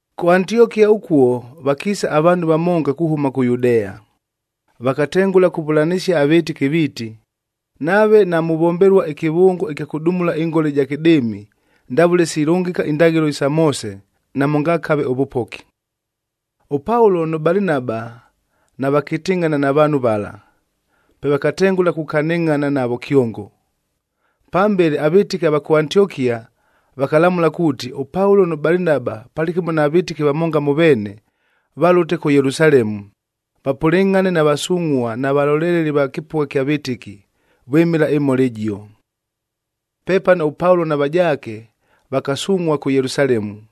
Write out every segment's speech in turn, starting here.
Kʉ Antiokia ʉkuo vakiisa avaanhu vamonga kuhʉma kʉ Yudea. Vakatengʉla kuvʉlanɨsia avɨtɨki viiti, “Nave namuvombelua ɨkɨvʉngo ɨkya kʉdumula ɨngola ɨja kɨdɨɨmia ndavʉle silʉngɨka indaghɨlo isa Moose, namʉngakave ʉvʉpoki.” ɄPaulo nʉ Balinaba navakɨtɨngʼhana na vaanhu vala, pe vakatengʉla kukanɨngʼhana navo kyongo. Pambele avɨtɨki ava kʉ Antiokia vakalamʉla kuuti, ʉPaulo nʉ Balinaba palɨkɨmo na vɨtɨki vamonga mʉ veene, valʉte kʉ Yelusalemu, vapʉlɨngʼhane na vasungʼhua na valoleleli va kɨpʉgha ɨkya vɨtɨki, vwɨmɨla ɨmhola ɨjio. Pepano ʉPaulo na vajaake vakasungʼhua kʉ Yelusalemu.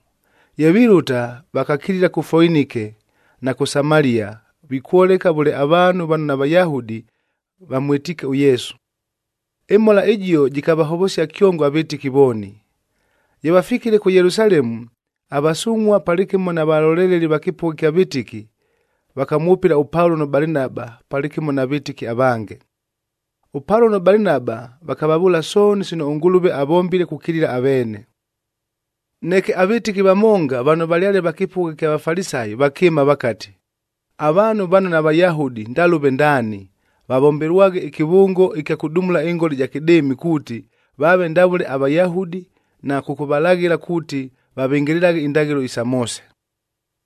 Ye vilʉta, vakakilila kʉ Foinike na kʉ Samalia, vikwoleka vʉle avaanhu vano naVayahudi vamwɨtiike ʉYesu. Ɨmhola ɨjio jɨkavahovosia kyongo avɨtɨki vooni. Ye vafikile kʉ Yelusalemu, avasungʼhua palɨkɨmo na valoleleli va kɨpʉgha ɨkya vɨtɨki, vakamwʉpɨla ʉPaulo nʉ Balinaba palɨkɨmo na vɨtɨki avange. ɄPaulo nʉ Balinaba vakavavʉʉla sooni sino ʉNgʉlʉve avombile kukilila aveene. Neke avɨtɨki vamonga vano valyale va kɨpʉgha ɨkya Vafalisayi vakɨɨma vakati, “Avaanhu vano naVayahudi ndalʉve ndaani, vavombelwaghe ɨkɨvʉngo ɨkya kʉdumula ɨngola ɨja kɨdɨɨmi kuuti, vaave ndavʉle aVayahudi na kʉkʉvalaghɨla kuuti, vavɨngɨlɨlaghe indaghɨlo isa Moose.”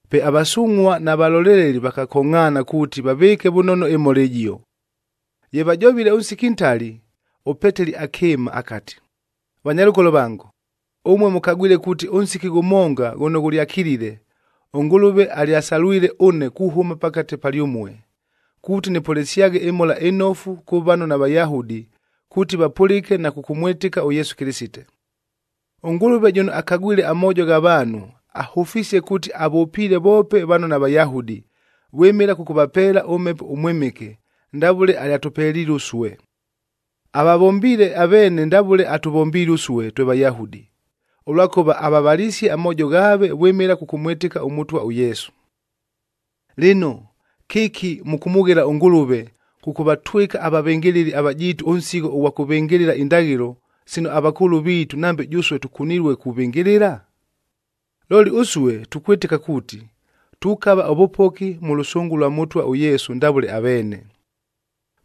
Pe avasungʼhua na valoleleli vakakongʼhaana kuuti vavɨɨke vʉnono ɨmhola ɨjio. Ye vajovile ʉnsiki ntali, ʉPeteli akɨɨma akati, “Vanyalʉkolo vango, ʉmue mʉkagwile kuuti ʉnsiki ghʉmonga ghʉno ghʉlyakilile,b ʉNgʉlʉve alyasalwile ʉne kuhʉma pakate palyʉmue, kuuti nɨpʉlɨsyaghe ɨMhola ɨNofu kʉ vano naVayahudi kuuti vapʉlɨke na kʉkʉmwɨtɨka ʉYesu Kɨlɨsite. ɄNgʉlʉve jʉno akagwile amoojo gha vaanhu, ahʉfisie kuuti avʉpiile voope vano naVayahudi, vwɨmɨla kʉkʉvapeela ʉMhepo ʉMwɨmɨke ndavʉle alyatʉpeliile ʉsue. Avavombiile aveene ndavʉle atʉvombiile ʉsue twe Vayahudi, ʉlwakʉva avavalisie amoojo ghaave vwɨmɨla kʉkʉmwɨtɨka ʉMʉtwa ʉYesu. Lɨno, kɨki mʉkʉmʉghela ʉNgʉlʉve, kʉkʉvatwɨka avavɨngɨlɨli avajiitu ʉnsigho ʉghwa kʉvɨngɨlɨla indaghɨlo, sino avakʉʉlʉ viitu nambe jʉsue tʉkunilue kuvɨngɨlɨla? Looli ʉsue tukwɨtɨka kuuti, tukava ʉvʉpoki mʉ lʉsʉngʉ lwa Mʉtwa ʉYesu ndavʉle aveene.”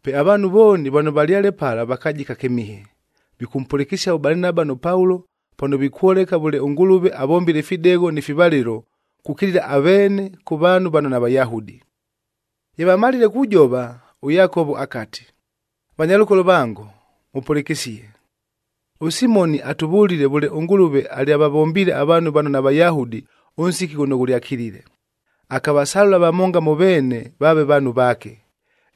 Pe avaanhu vooni vano valyale pala vakajika kɨmihe, vikʉmpʉlɨkɨsia ʉBalinaba nʉ Paulo pano vikwoleka vʉle ʉNgʉlʉve avombile ifidegho ni fivalɨlo kukilila aveene kʉ vaanhu vano naVayahudi. Ye vamalile kujova, ʉYakovo akati, “Vanyalʉkolo vango, mʉpʉlɨkɨsie! ɄSimonic atʉvʉlile vʉle ʉNgʉlʉve alyavavombiile avaanhu vano naVayahudi ʉnsiki ghʉno ghʉlyakilile, akavasalʉla vamonga mʉ veene vaave vaanhu vaake.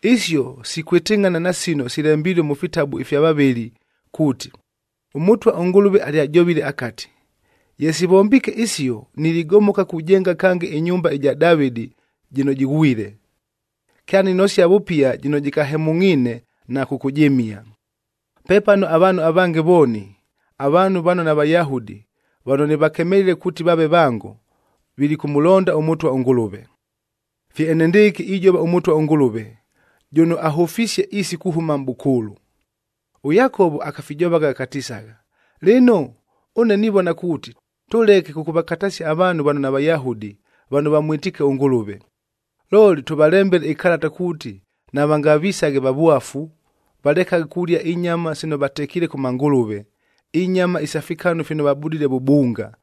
Isio sikwɨtɨngʼhana na sino silembilue mʉ fitabu ifya vavɨli kuuti, ‘ɄMʉtwa ʉNgʉlʉve alyajovile akati, “Ye sivombiike isio, niligomoka kujenga kange ɨnyumba ɨja Davɨdi jɨno jɨghwile. Kyaninosia vʉpia jɨno jɨkahemʉngʼhiine, na kʉkʉjɨmia. Pepano avaanhu avange vooni, avaanhu vano naVayahudi vano nɨvakemelile kuuti vaave vango, vilikʉmʉlonda ʉMʉtwa ʉNgʉlʉve.”d Fye enendɨɨkɨ ijova ʉMʉtwa ʉNgʉlʉve, jʉno ahʉfisie isi kuhʉma mʼbʉkʉʉlʉ.’” ɄYakovo akafijovagha akatisagha, “Lɨno, ʉne nivona kuuti, tʉleke kʉkʉvakatasia avaanhu vano naVayahudi, vano vamwɨtiike ʉNgʉlʉve. Looli, tʉvalembele ɨkalata kuuti navangavisaghe vavwafu, valekaghe kulia inyama sino vatekiile kʉ mangʉlʉve, inyama isa fikanu fino vabudile vʉbunga,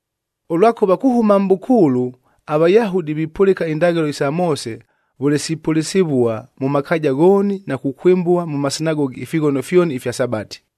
Ʉlwakʉva kuhʉma mʼbʉkʉʉlʉ, aVayahudi vipʉlɨka indaghɨlo isa Moose vʉle sipʉlɨsɨvua mʉ makaaja ghooni na kukwɨmbua mʉ masinagogi ifighono fyoni ifya Sabati.”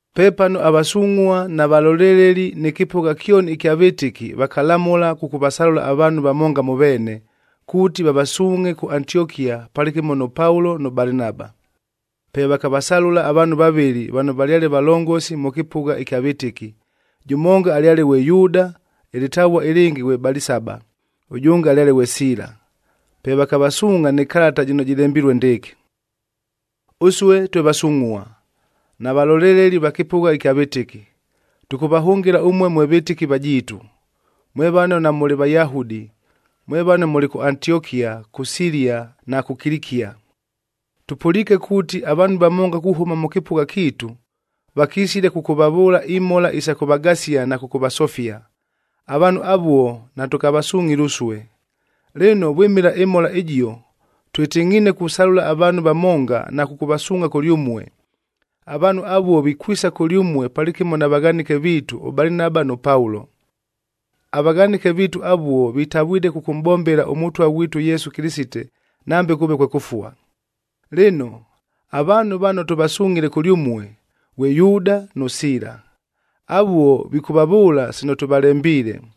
Pepano avasungʼhua na valoleleli nɨ kɨpʉgha kyoni ɨkya vɨtɨki vakalamʉla kʉkʉvasalʉla avaanhu vamonga mʉ veene, kuuti vavasuungʼhe kʉ Antiokia palɨkɨmo nʉ Paulo nʉ Balinaba. Pe vakavasalʉla avaanhu vavɨlɨ vano valyale valongosi mʉ kɨpʉgha ɨkya vɨtɨki, jʉmonga alyale ghwe Yuuda, ɨlɨtavua ɨlɨngɨ ghwe Balisaba, ʉjʉnge alyale ghwe Siila. Pe vakavasuungʼha nɨ kalata jɨno jɨlembilue ndɨɨkɨ, “Ʉsue twe vasungʼhua, na valoleleli va kɨpʉgha ɨkya vɨtɨki, tʉkʉvahʉngɨla ʉmue mwe vɨtɨki vajiitu, mwe vano namʉlɨ Vayahudi mwe vano mʉlɨ kʉ Antiokia, kʉ Silia na kʉ Kilikia. Tʉpʉliike kuuti, avaanhu vamonga kuhʉma mʉ kɨpʉgha kiitu, vakisile kʉkʉvavʉʉla imhola isa kʉvagasia na kʉkʉvasofia. Avaanhu avuo natʉkavasungʼhile ʉsue. Lɨno, vwɨmɨla ɨmhola ɨjio, twɨtɨngʼhiine kusalʉla avaanhu vamonga na kʉkʉvasuungʼha kʉlyʉmue. Avaanhu avuo vikwisa kʉlyʉmue palɨkɨmo na vaghanɨke viitu ʉBalinaba nʉ Paulo. Avaghanɨke viitu avuo vitavwile kʉkʉmʼbombela ʉMʉtwa ghwitu ʉYesu Kɨlɨsite, nambe kʉʉve kwe kʉfua. Lɨno, avaanhu vano tʉvasungʼhile kʉlyʉmue, ghwe Yuuda nʉ Siila. Avuo vikʉvavʉʉla sino tʉvalembiile.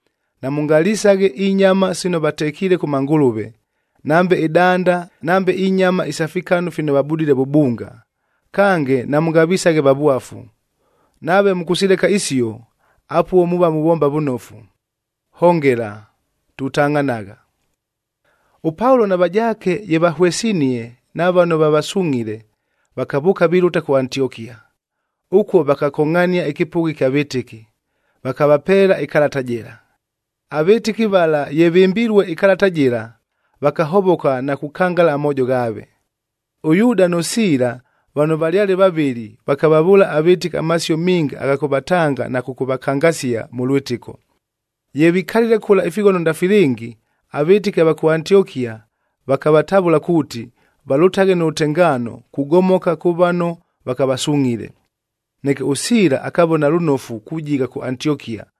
Namʉngalisaghe inyama sino vatekiile kʉ mangʉlʉve, nambe ɨdanda nambe inyama isa fikanu fino vabudile vʉbunga, kange namʉngavisaghe vavwafu. Nave mʉkʉsileka isio, apuo muuva muvomba vʉnofu. Hongela! Tutangʼhanagha!” ɄPaulo na vajaake ye vahwesinie na vano vavasungʼhile, vakavʉʉka vilʉta kʉ Antiokia. Ʉkuo vakakongʼhania ɨkɨpʉgha ɨkya vɨtɨki, vakavapeela ɨkalata jɨla. Avɨtɨki vala ye vɨmbilue ɨkalata jɨla, vakahovoka na kukangala amoojo ghaave. ɄYuuda nʉ Siila vano valyale vavɨli, vakavavʉʉla avɨtɨki amasio minga agha kʉvatanga na kʉkʉvakangasia mʉ lwɨtɨko. Ye vikalile kʉla ifighono ndafilɨngi, avɨtɨki ava kʉ Antiokia vakavatavʉla kuuti, valʉtaghe nʉ lʉtengaano kugomoka kʉ vano vakavasungʼhile. Neke ʉSiila akavona lʉnofu kujigha kʉ Antiokia,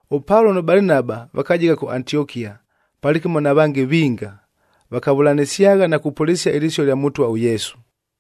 ɄPaulo nʉ Balinaba vakajigha kʉ Antiokia, palɨkɨmo na vange vinga, vakavʉlanɨsyagha na kupʉlɨsia ɨlɨsio lya Mʉtwa ʉYesu.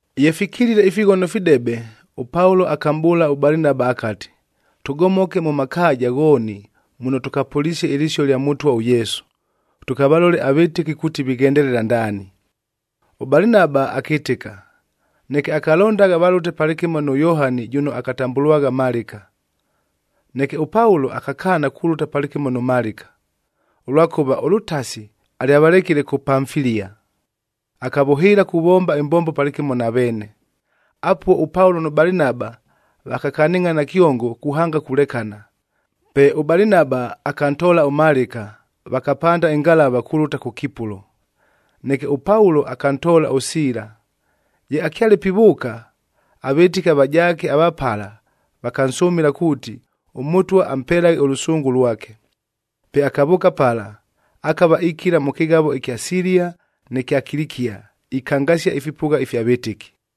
Ye fikilile ifighono fidebe, ʉPaulo akamʼbʉʉla ʉBalinaba akati, “Tʉgomoke mʉ makaaja ghooni muno tʉkapʉlisie ɨlɨsio lya Mʉtwa ʉYesu, tʉkavalole avɨtɨki kuuti vighendelela ndaani.” ɄBalinaba akɨtɨka, neke akalondagha valʉte palɨkɨmo nʉ Yohani jʉno akatambʉlwagha Malɨka. Neke ʉPaulo akakaana kulʉta palɨkɨmo nʉ Malɨka, ʉlwakʉva ʉlʉtasi alyavalekile kʉ Pamfilia, akavʉhɨɨla kuvomba ɨmbombo palɨkɨmo na veene. Apuo ʉPaulo nʉ Balinaba vakakanɨngʼhana kyongo kuhanga kulekana. Pe ʉBalinaba akantoola ʉMalɨka, vakapanda ɨngalava kulʉta kʉ Kipulo. Neke ʉPaulo akantoola ʉSiila. Ye akyale pivʉʉka, avɨtɨki avajaake ava pala vakansʉmɨla kuuti, ʉMʉtwa ampelaghe ʉlʉsʉngʉ lwake. Pe akavʉʉka pala, akava ikila mʉ kɨghavo ɨkya Silia nɨ kya Kilikia, ikangasia ifipʉgha ifya vɨtɨki.